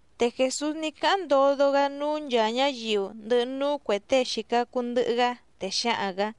Te Jèsús ní cáháⁿ ndodo‑gá núú nchàa ñáyiu, ndɨhɨ núú cuè tée xìca cuu ndɨhɨ‑gá, te xǎhaⁿ‑gǎ: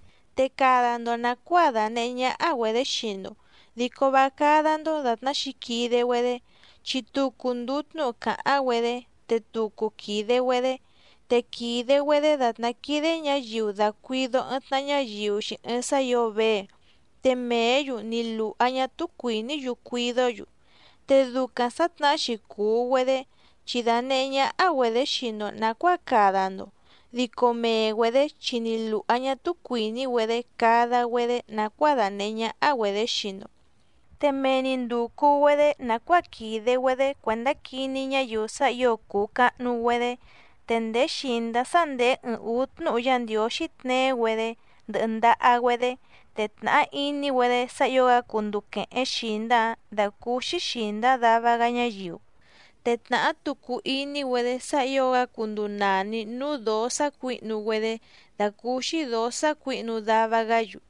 Te cada‑ndo nàcuáa dànehé ñáhá‑güedě xii‑ndo, dico vá cádá‑ndó dàtná xǐquide‑güedé, chi tucu ndùu tnúhu càháⁿ‑güedé, te tucu quìde‑güedé. Te quìde‑güedé dàtná quídé ñǎyiu dàcuido ɨɨⁿ tnaha ñáyiu‑xi ɨɨⁿ sá ǐo vée, te mèé‑yu ni lùha ñá túú cuìní‑yu cuidó‑yu. Te ducaⁿ sǎtnahá‑xi cùu‑güedé chi dànehé ñáhá‑güedě xii‑ndo nàcuáa cada‑ndo, dico mee‑güedě chi ni lùha ñá túú cuìní‑güedé cada‑güedé nàcuáa dànehé ñáhá‑güedě xii‑ndo. Te mee‑ni ndùcu‑güedé nàcuáa quìde‑güedé cuèndá quiní ñáyiu sá ǐo cùu cahnu‑güedé. Te ndèé xìndá sá ndèé ɨɨⁿ ǔú tnúhu Yá Ndiǒxí tneé‑güedé ndɨhɨ ndaha‑güedé, te tnàhá iní‑güedé sá ǐo‑gá cunduu quèhéⁿ xìndá‑áⁿ dàcúúxí xìndá dava‑gá ñáyiu. Te tnàhá tucu iní‑güedé sá ǐo‑gá cunduu nàni núú dǒó sácuǐhnu‑güedé dàcúúxí dǒó sácuǐhnu dava‑gá‑yu.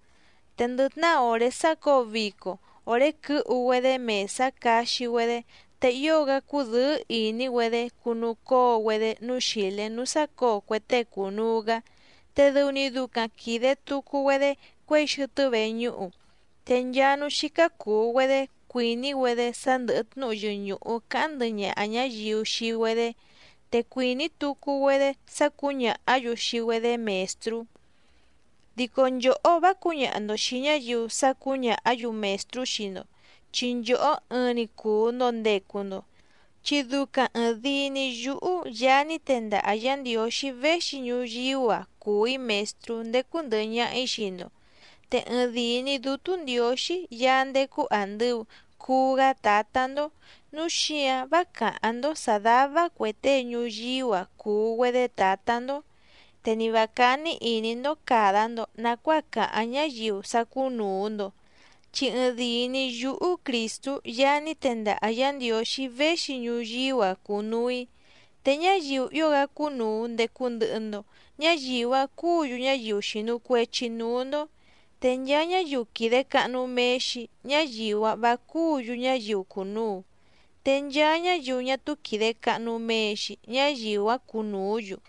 Te ndɨ tnahá òré sácǒo vico, òré quɨ́hu‑güedé mèsá caxi‑güedé te ío‑gá cúdɨ̌ɨ́ ìní‑güedé cunucóo‑güedé núú xìlé núú sácǒo cue tée cùnuu‑gá, te dɨu‑ni ducaⁿ quìde tucu‑güedé cuěi xɨtɨ́ veñúhu. Te nchaa núú xícá cùu‑güedé cuìní‑güedé sá ndɨ̀hɨ tnúhu yɨñùhu cáháⁿ ndɨhɨ ñaha ñǎyiu xii‑güedé, te cuìní tucu‑güedé sá cǔñàhá‑yu xii‑güedé mèstrú. ’Dico nchòhó vá cǔñaha‑ndo xìi ñáyiu sá cǔñàhá‑yu mèstrú xii‑ndo, chi nchòhó ɨɨⁿ‑ni cùu‑ndo ndecu‑ndo, chi ducaⁿ ɨ̀ɨⁿdii‑ni yúhú Yaá ní tendaha Yǎ Ndiǒxí véxi ñuyíú‑a cùu‑í Mèstrú ndécú ndɨ̀hɨ ñaha‑í xii‑ndo. Te ɨɨⁿdìi‑ni Dútú Ndiǒxí Yaá ndécú àndɨu cuu‑gá Tǎtá‑ndó, núu xíǎⁿ vá càháⁿ‑ndó sǎ dàva cue tée ñuyíú‑a cùu‑güedé tǎtá‑ndó. Te ni vǎ cání ìní‑ndó càda‑ndo nacuáa cáháⁿ ñáyiu sá cúnùu‑ndo, chi ɨɨⁿdìi‑ni yúhú Crìstú Yaá ní tendaha Yǎ Ndiǒxí véxi ñuyíú‑a cùnuu‑í. Te ñáyiu ío‑gá cúnùu ndecu ndɨhɨ‑ndo, ñáyiu‑áⁿ cúǔ‑yu ñáyiu xìnu cuechi núú‑ndó. Te nchaa ñáyiu quìde cahnu mee‑xi ñáyiu‑áⁿ vǎ cúǔ‑yu ñáyiu cùnuu, te nchaa ñáyiu ñá túú quìde cahnu mee‑xi ñáyiu‑áⁿ cunùú‑yu.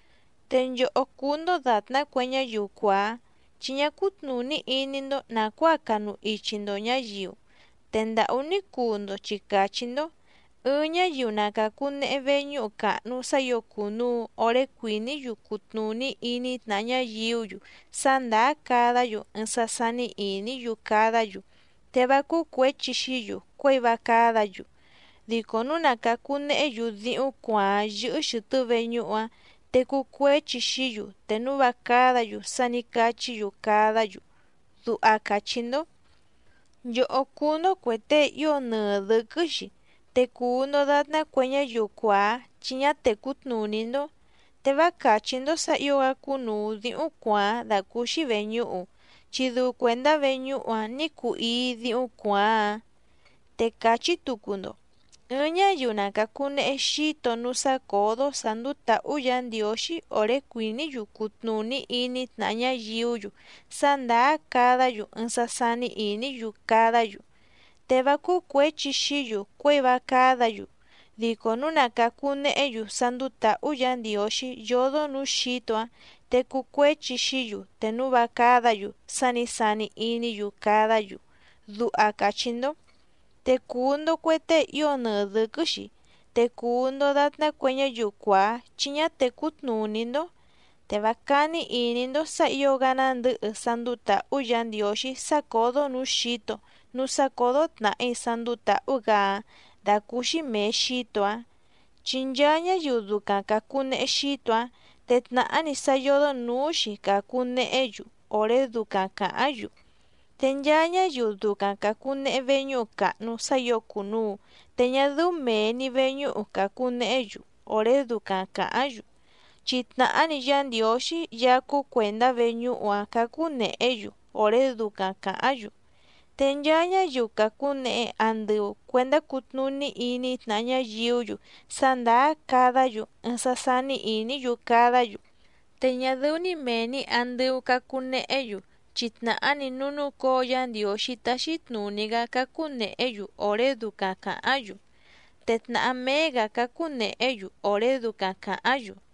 ’Te nchòhó cúú‑ndó dàtná cue ñáyiu cuàá, chi ñá cútnùní iní‑ndó nàcuáa canu ichi‑ndo ñǎyiu, te ndàhú ní cuu‑ndo chi càchí‑ndó: “Ɨɨⁿ ñáyiu na càcunehe veñúhu càhnu sá ǐo cùnuu oré cuìní‑yu cutnùní iní tnàha ñáyiú‑yu sá ndàá cadá‑yu ɨɨⁿ sá sání ìní‑yu cadá‑yu, te vá cúú cuěchi xií‑yu cuěi vá cádǎ‑yu. Dico núu na càcu nehé‑yu díhúⁿ cuàáⁿ yɨ́hɨ́ xɨ̀tɨ́ veñúhu‑áⁿ te cuu cuéchi xií‑yu te núu vá cádǎ‑yu sá nǐ cachí‑yu cadá‑yu”, duha càchí‑ndó. ’¡Nchòhó cúú‑ndó cuè tée ío nɨɨ dɨ̌quɨ́‑xi, te cùu‑ndo datná cue ñáyiu cuàá chi ñá tècú tnùní‑ndó! Te vá càchí‑ndó sǎ ǐo‑gá cúnùu díhúⁿ cuàáⁿ dàcúúxí vèñúhu, chi dɨu cuèndá veñúhu‑áⁿ nǐ cuu íí dǐhúⁿ cuàáⁿ‑áⁿ. Te càchí tucu‑ndo: “Ɨɨⁿ ñáyiu na càcunehe xíto núú sácǒdó sǎ ndúú tǎhú Yǎ Ndiǒxí òré cuìní‑yu cutnùní iní tnàha ñáyiú‑yu sá ndàá cadá‑yu ɨɨⁿ sá sání ìní‑yu cadá‑yu, te vá cúú cuěchi xií‑yu cuěi vá cádǎ‑yu, dico núu na càcu nehé‑yu sá ndúú tǎhú Yǎ Ndiǒxí yódó nǔú xǐto‑áⁿ te cuu cuéchi xií‑yu te núu vá cádǎ‑yu sá nǐ sani iní‑yu cadá‑yu”, duha càchí‑ndó. ¡Te cùu‑ndo cue tée ío nɨɨ dɨ̌quɨ́‑xi, te cùu‑ndo datná cue ñáyiu cuàá chi ñá tècú tnùní‑ndó! Te vá cání ìní‑ndó sǎ ǐo‑gá nándɨ̌hɨ sá ndúú tǎhú Yǎ Ndiǒxí sácǒdó nǔú xǐto núú sácǒdó tnàhí sá ndúú tǎhú‑gǎ‑áⁿ dàcúúxí mèe xíto‑áⁿ. Chi nchaa ñáyiu ducaⁿ càcunehe xíto‑áⁿ, te tnàhá‑ni sá yódó nǔú‑xi càcu nehé‑yu òré ducaⁿ càháⁿ‑yu. Te nchaa ñáyiu ducaⁿ càcunehe veñúhu càhnu sá ǐo cùnuu te ñá dɨ́ú mèe‑ni veñúhu càcu nehé‑yu òré ducaⁿ càháⁿ‑yu, chi tnàhá‑ni Yá Ndiǒxí Yaá cúú cuèndá veñúhu‑áⁿ cácú nèhé‑yu òré ducaⁿ càháⁿ‑yu. Te nchaa ñáyiu càcunehe andɨu cuendá cutnùní iní tnàha ñáyiú‑yu sá ndàá cadá‑yu ɨɨⁿ sá sání ìní‑yu cadá‑yu, te ñá dɨ́ú mèe‑ni andɨu cacu nehé‑yu chi tnàhá‑ni núú núcǒo Yá Ndiǒxí táxí tnùní‑gá cácú nèhé‑yu òré ducaⁿ càháⁿ‑yu, te tnàhá méé‑gǎ cácú nèhé‑yu òré ducaⁿ càháⁿ‑yu.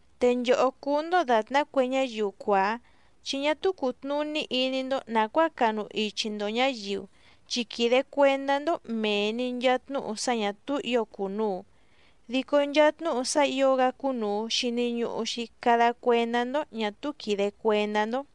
¡Te nchòhó cúú‑ndó dàtná cue ñáyiu cuàá, chi ñá túú cùtnuní iní‑ndó nàcuáa canu ichi‑ndo ñǎyiu, chi quìde cuendá‑ndó mèe‑ni nchaa tnúhu sá ñà túú ǐo cùnuu, dico nchaa tnúhu sá ǐo‑gá cúnùu xini ñuhu‑xi cada cuendá‑ndó ñà túú quìde cuendá‑ndó!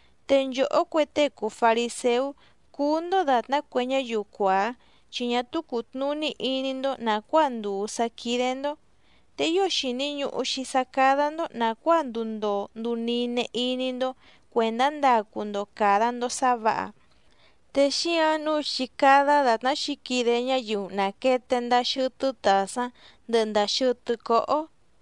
Te nchòhó cue tée cùu fariséú, cúú‑ndó dàtná cue ñáyiu cuàá, chi ñá túú cùtnuní iní‑ndó nàcuáa ndùu sá quídé‑ndó. Te ío xìni ñuhu‑xi sá cádá‑ndó nàcuáa nduu ndoo nduu nine iní‑ndó cuèndá ndacu‑ndo càda‑ndo sá vǎha, te xíǎⁿ nǔu chí cádá dàtná xǐquide ñáyiu nàquete ndaa xɨtɨ́ tàsáⁿ ndɨhɨ ndàa xɨtɨ́ cóhó.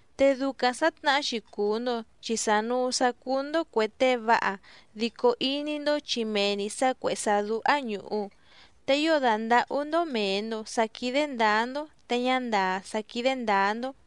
Te ducaⁿ sǎtnahá‑xi cùu‑ndo chi sànuu sá cúú‑ndó cuè tée váha dico iní‑ndó chi mee‑ni sǎ cuèhé sá dúhá ñùhu, te ío dàndahú‑ndó mèe‑ndo sá quídé ndǎá‑ndó te ñá ndàá sá quídé ndǎá‑ndó.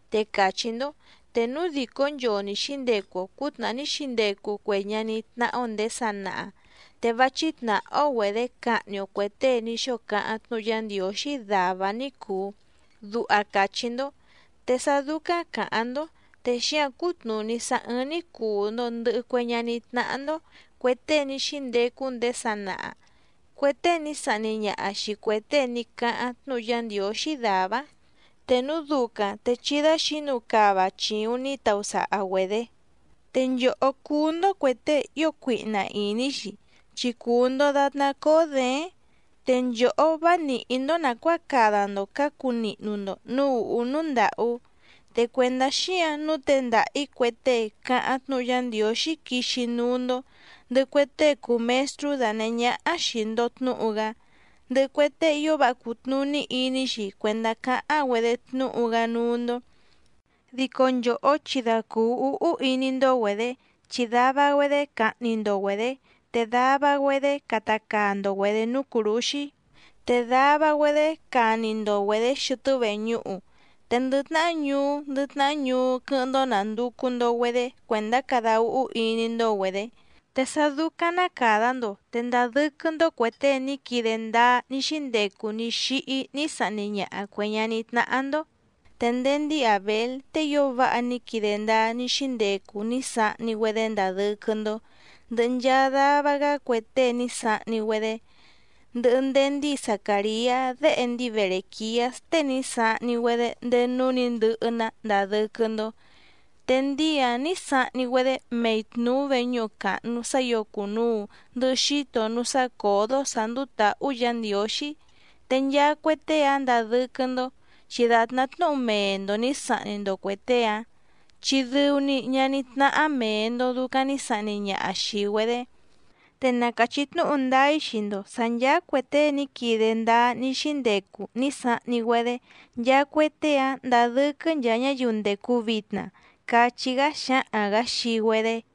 Te càchí‑ndó: “Te núu dìcó nchoo ni xǐndecu‑o cǔtnàhá ní xíndecu cue ñaní tnáhá‑ó nděé sanaha, te vá chítnàhá‑ó‑güedě cahni‑o cuè tée ní xóo cáháⁿ tnúhu Yá Ndiǒxí dàvá‑áⁿ ní cùu”, duha càchí‑ndó. Te sá dúcáⁿ càháⁿ‑ndó, te xíǎⁿ cútnùní sá ɨ́ɨ́ⁿ‑ní cùu‑ndo ndɨhɨ cue ñaní tnáhá‑ndó cuè tée ní xíndecu ndéé sanaha, cue tée ní sahni ñaha xìi cue tée ní cáháⁿ tnúhu Yá Ndiǒxí dàvá‑áⁿ. Te núu ducaⁿ te chí dáxǐnu cava chìuⁿ ní tausaha‑güedě. ’¡Te nchòhó cúú‑ndó cuè tée ío cuihna ìní‑xi, chi cùu‑ndo datná cóó děéⁿ! Te nchòhó vá nìhí‑ndó nàcuáa cada‑ndo cǎcu nihnu‑ndo nǔú ùhú núú ndàhú. Te cuèndá xíǎⁿ nǔu tendaha‑ǐ cue tée càháⁿ tnúhu Yá Ndiǒxí quixi núú‑ndó, ndɨhɨ cue tée cùu mestrú danèhé ñáhá xìi‑ndo tnúhu‑gá, ndɨhɨ cue tée ío váha cùtnuní iní‑xi cuèndá cáháⁿ‑güedé tnúhu‑gá núú‑ndó. Dico nchòhó chi da cùu úhú iní‑ndó‑güedě, chi dava‑güedé cahni‑ndo‑güedě, te dava‑güedé cata caa‑ndo‑güedě núú cùrúxí, te dava‑güedé cani‑ndo‑güedě xɨtɨ́ veñúhu, te ndɨ tnahá ñuú ndɨ tnahá ñuú quɨ́hɨ́ⁿ‑ndó nànducu‑ndo‑güedé cuèndá cada úhú iní‑ndó‑güedě. Te sá dúcáⁿ ná càda‑ndo, te ndadɨ́quɨ́‑ndó cuè tée ní quide ndáá ní xíndecu ní xíhí ní sahni ñaha cuè ñaní tnáhá‑ndó. Te ndéé ndíi Àbél tée ío váha ní quide ndáá ní xíndecu ní sahni‑güedé ndadɨ́quɨ́‑ndó, ndɨhɨ nchaa dava‑gá cue tée ní sahni‑güedé, ndɨhɨ ndéé ndíi Zacàriá déhe ndíi Berèquiás tée ní sahni‑güedé ndéé núú nǐ ndɨhɨ‑ná ndadɨ́quɨ́‑ndó, te ndíi‑áⁿ nǐ sahni‑güedé mei tnùú veñúhu càhnu sá ǐo cùnuu ndɨhɨ xíto núú sácǒdó sǎ ndúú tǎhú Yǎ Ndiǒxí, te nchaa cue tée‑áⁿ ndadɨ́quɨ́‑ndó chi dàtná tnúhu mee‑ndo nǐ sahni‑ndo cuè tée‑áⁿ, chi dɨu‑ni ñaní tnáhá mèe‑ndo ducaⁿ ní sahni ñaha xìi‑güedé. Te na càchí tnúhu ndáá‑í xii‑ndo sǎ nchàa cue tée ní quide ndáá ní xíndecu ní sahni‑güedé, nchaa cue tée‑áⁿ ndadɨ́quɨ́ nchaa ñáyiu ndècu vitna —cachí‑gá xǎhaⁿ‑gǎ xii‑güedé.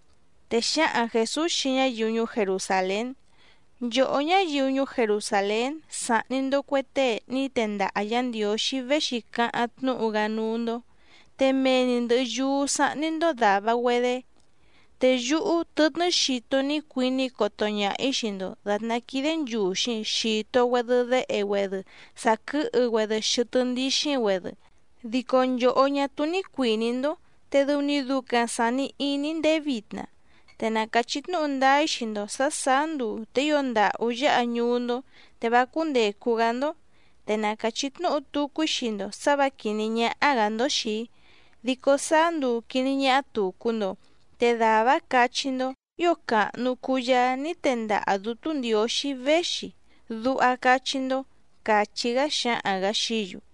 Te xǎhaⁿ Jèsús xii ñáyiu ñuú Jerusàlén: —Nchòhó ñáyiu ñuú Jerusàlén sàhni‑ndo cue tée ní tendaha Yǎ Ndiǒxí véxi càháⁿ tnúhu‑gá núú‑ndó, te mee‑ni ndɨ̀hɨ yúú sáhní‑ndó dàva‑güedé. ¡Te yúhú tɨtnɨ́ xito ní cuiní‑í coto ñaha‑ǐ xii‑ndo dàtná quídé nchùxi xito‑güedɨ déhe‑güedɨ sàquɨ́hɨ‑güedɨ xɨtɨ́ ndíxíⁿ‑güedɨ, dico nchòhó ñá túú ní cuìní‑ndó, te dɨu‑ni ducaⁿ sàni iní‑í ndéé vitna! Te na càchí tnúhu ndáá‑í xii‑ndo sǎ sàá nduu te ío ndàhú yáha ñuú‑ndó, te vá cúndècu‑gá‑ndó. Te na càchí tnúhu tucu‑í xii‑ndo sǎ vǎ quìní ñáhá‑gǎ‑ndó xìi‑í, dico sáá nduu quìní ñáhá tùcu‑ndo, te dàvá‑áⁿ cachí‑ndó: “Ío càhnu cuu Yaá ní tendaha Dǔtú Ndiǒxí véxi”, duha cachí‑ndó —càchí‑gá xǎhaⁿ‑gǎ xií‑yu.